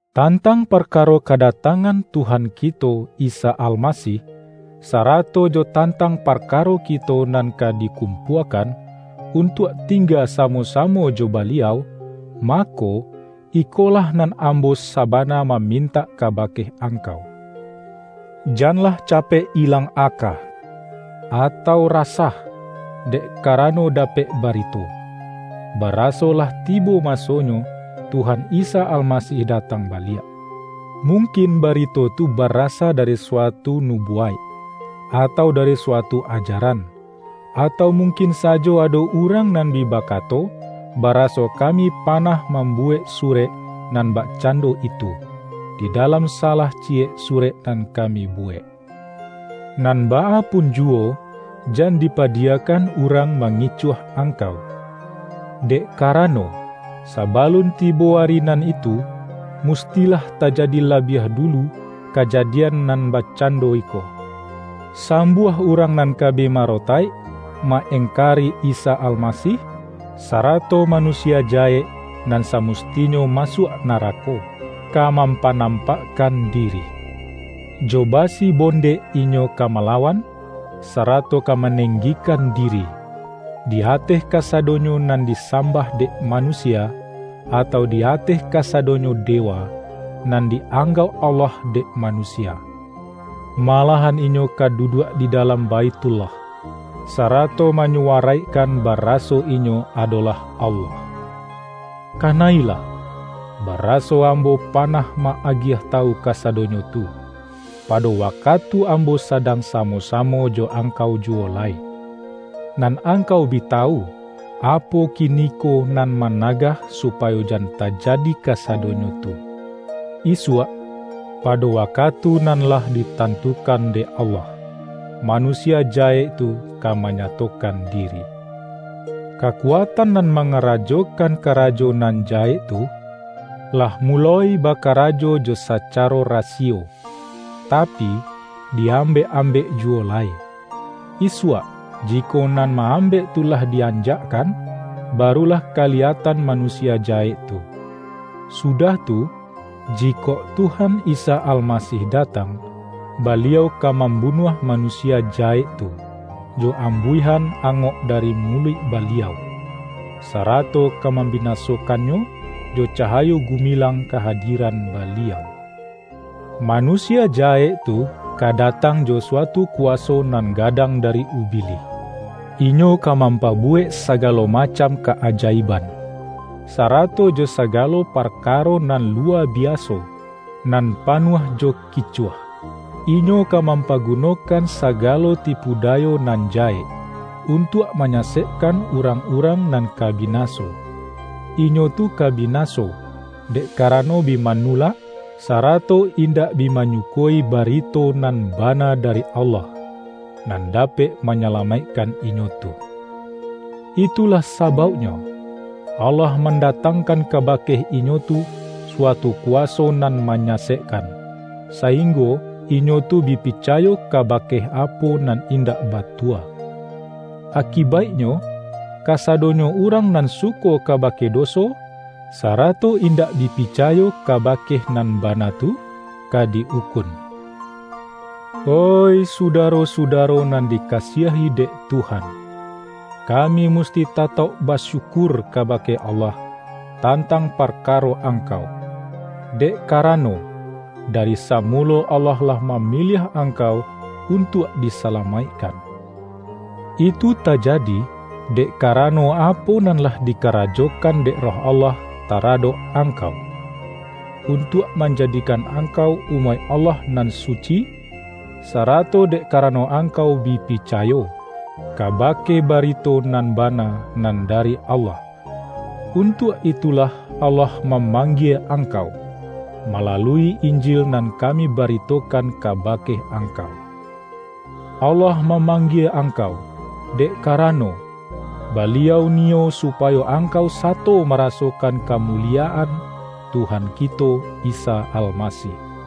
Tantang parkaro kadatangan Tuhan kito Isa Almasih, sarato jo tantang parkaro kito nan ka dikum-puakan, untuak tingga samo-samo jo Baliau, mako, ikolah nan ambo saba-na mamintak kabake angkau: Jan-lah capek ilang aka, atau rasah, dek karano dapek barito, baraso lah ti-bo masonyo Tuhan Isa Almasih da-tang baliak. Mungkin barito tu ba-rasa dari suatu nubuwaik, atau dari suatu ajaran; atau mungkin sajo ado urang nan bi bakato, baraso kami pa-nah mambuwek surek nan bakcando itu, di dalam salah ciyek surek nan kami buwek. Nan baa pun juwo, jan dipadiyakan urang mangicuah ang-kau. Dek karano, sabalun tibo Ari nan itu, mustilah tajadi labiah dulu kajadian nan bakcando iko: Sambuah urang nan ka bi marotaik, ma-eng-kari Isa Almasih; sarato Manusia Ja-hek nan samustinyo masuak narako, ka mampanampakkan diri. Jo basi-bondek inyo ka malawan, sarato ka manenggikan diri, di ateh kasadonyo nan disambah dek manusia, atau di ateh kasadonyo dewa, nan di ang-gauk Allah dek manusia. Malahan inyo ka duduak di dalam Baithullah, sarato manyuwaraikkan baraso inyo adolah Allah. Kana-ilah, baraso ambo panah ma-agiah tawu kasadonyo tu, pado waka-tu ambo sadang samo-samo jo angkau juwo lai. Nan angkau bi tawu, apo kiniko nan managah supayo jan tajadi kasadonyo tu. Isuak, pado wakatu nan lah ditantukan dek Allah, Manusia Ja-hek tu ka manyatokan diri. Kakuatan nan mangarajokan karajo nan jahek tu, lah muloi bakarajo jo sacaro rasiyo, ta-pi, di ambek-ambek juwo lai. Isuak, ji-kok nan ma-ambek tu lah di-anjakkan, barulah kaliyatan Manusia Jahek tu. Sudah tu, jikok Tuhan Isa Almasih da-tang, Baliau ka mambunuah Manusia Jahek tu, jo ambuihan angok dari mu-luik Baliau, sarato ka mambinasokan-nyo jo cahayo gumilang kahadiran Ba-liau. Manusia Jahek tu ka datang jo suatu kuwaso nan gadang dari Ubi-lih. Inyo ka mampabuwek sagalo ma-cam ka-ajaiban, sarato jo sagalo par-karo nan luwa biaso, nan panuah jo kicuah. Inyo ka mampagunokan sa-galo tipu dayo nan jahek, untuak ma-nyasekkan urang-urang nan ka bina-so. Inyo tu ka binaso, dek karano bi manulak, sarato indak bi manyuko-i barito nan bana dari Allah, nan dapek manyalamaikkan inyo tu. Itulah sa-bauknyo, Allah mandatangkan kabake inyo tu suatu kuwaso nan manyasek-kan, sainggo inyo tu bi picayo kabake apo nan indak batua. Akibaiknyo, kasadonyo urang nan suko kabake do-so, sarato indak bi picayo kabake nan bana tu, ka di-ukun. Oih sudaro-sudaro nan dika-siahi dek Tuhan! Kami musti ta-tauk basyukur kabake Allah tan-tang parkaro angkau, dek karano, dari samulo Allah lah mamiliah ang-kau untuak disalamaikkan. Itu ta-jadi, dek karano apo nan lah di-karajokan dek Roh Allah taradok angkau, untuak manjadikan ang-kau umaik Allah nan suci, sarato dek karano angkau bi picayo, kaba-ke barito nan bana nan dari Allah. Untuak itulah Allah mamanggie angkau, malalui Injil nan kami baritokan kabake angkau. Allah ma-manggie angkau, dek karano, Baliau niyo supayo angkau sato marasokan kamuliyaan Tuhan kito Isa Almasih.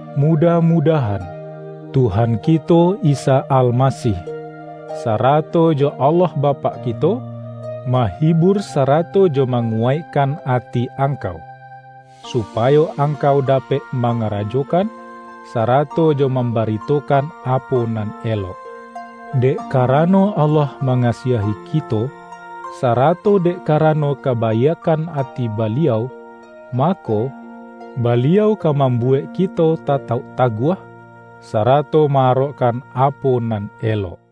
Mudah-mudahan, Tuhan kito Isa Almasih, sarato jo Allah Bapak kito, mahibur sarato jo manguwaik-kan ati angkau, supayo angkau da-pek mangarajokan, sarato jo mam-baritokan apo nan elok. Dek karano Allah mangasiahi kito, sarato dek karano kabaiakkan ati Baliau, ma-ko, Baliau ka mambuwek kito ta-tauk taguah, sarato ma-arokkan apo nan elok.